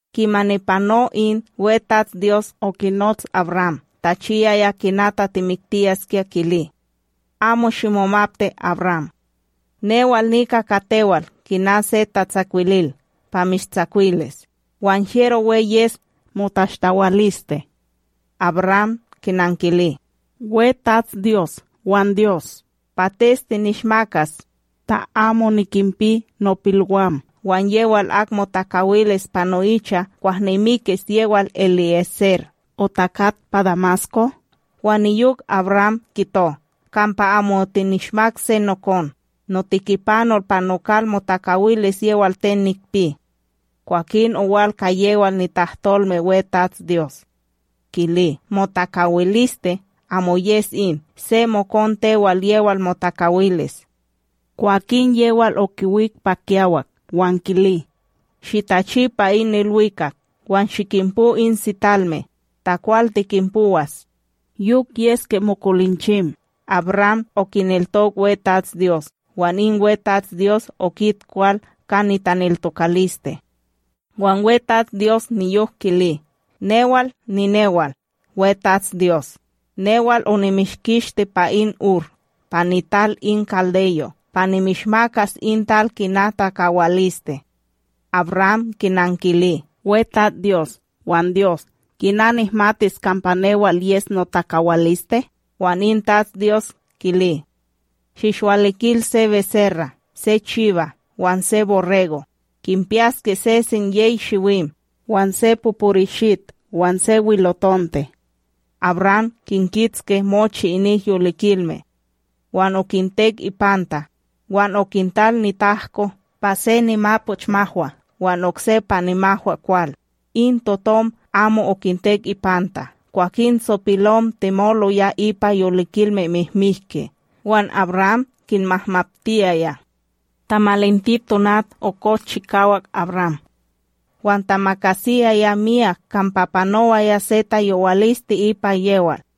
Kimani pano in, WeTatsDyos okinots AbRam tachiyaya kina tatimiktiyaskya kili: “Amo shimomapti, AbRam. Newal nika ka tewal kina se tatsakwilil pa mishtsakwilis, wan hyero we yes motashtawaliste.” AbRam kinankili: ―WeTatsDyos wan Dyos, pates tinishmakas ta amo nikinpi nopilwam, wan yewal ak motakawilis pa no'icha kwah nimikis yewal EliÉser otakat pa Damasko? Wan niyok AbRam kito: Kampa amo otinishmak se nokon, notikipanol pa nokal motakawilis yewal ten nikpi. Kwakin owal ka yewal nitahtolme WeTatsDyos kili: ―Motakawiliste amo yes in, se mokon tewal, yewal motakawilis. Kwakin yewal okiwik pa kiyawak wan kili: ―Shitachi pa in ilwikak wan shikinpo in sitalme, ta kwal tikinpowas. Yok yeske mokolinchim! AbRam okineltok WeTatsDyos, wan in WetatsDyos okit kwal ka nitaneltokaliste. Wan WeTatsDyos niyok kili: ―Newal ninewal WeTatsDyos, newal onimishkishti pa in Ur pa nital in kaldeyo' pa nimishmakas in tal kina takawaliste. AbRam kinankili: ―WeTatsDyos wan Dyos, kina nihmatis kampa newal yes notakawaliste? Wan in WeTatsDyos, kili: ―Shinishwalikil se beserra, se chiba wan se borrego, kinpiyaske sesen yey shiwim, wan se poporishit wan se wilotonte. AbRam kinkitske mochi inik yolikilme, wan okintek ipanta, wan okintal nitahko pa se nimapochmahwa wan okse pa nimahwakwal, in totom amo okintek ipanta. Kwakin tsopilom temoloya ipa yolikilme mihmiki, wan AbRam kinmahmaptiyaya. Tamalinti tonat, okoch chikawak AbRam, wan tamakasiyaya miyak kampa panowaya se tayowaliste ipa yewal.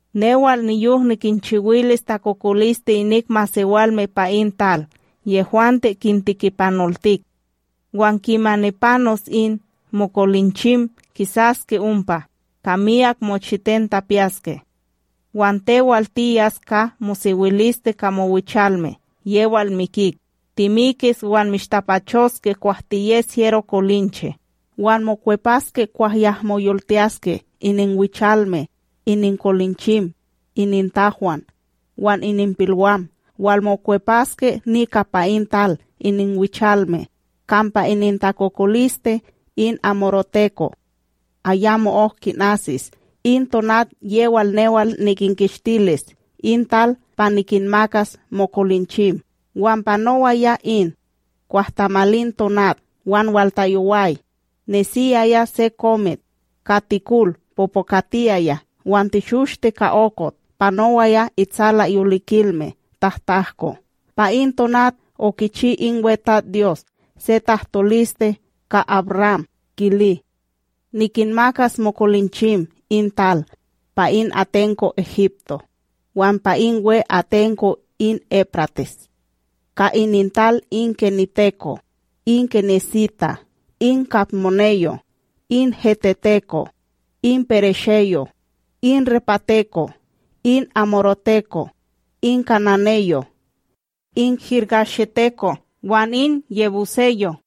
Newal niyok nikinchiwilis takokoliste inik masewalme pa in tal yehwante kintikipanoltik, wan kimani panos in, mokolinchim kisaske ompa ka miyak mochiten tapiyaske. Wan tewal, tiyas ka mosewiliste ka mowichalme yewal mikik, timikis wan mishtapachoske kwah tiyes hyero kolinche. Wan mokwepaske kwah yahmo yoltiyaske ininwichalme, ininkolinchim, inintahwan wan ininpilwam walmokwepaske nika pa in tal ininwichalme, kampa inintakokoliste in amoreteko' ayamo'ok kinasis in tonat yewal newal nikinkishtilis in tal pa nikinmakas mokolinchim. Wan panowaya in, kwah tamalin tonat wan waltayoway, nesiyaya se komit ka tikol popokatiyaya wan teshoshte ka okot panowaya itsalaYolikilme tahtahko. Pa in tonat okichi in WeTatsDyos se tahtoliste ka AbRam kili: ―Nikinmakas mokolinchim in tal, pa in atenko Egipto wan pa in we atenko, in Éprates. Ka inintal in keniteko', in kenisita', in kadmoneyo', In heteteko', in peresheyo', in repateko', in amoreteko, in kananeyo', in girgasheteko' wan in yebuseyo'.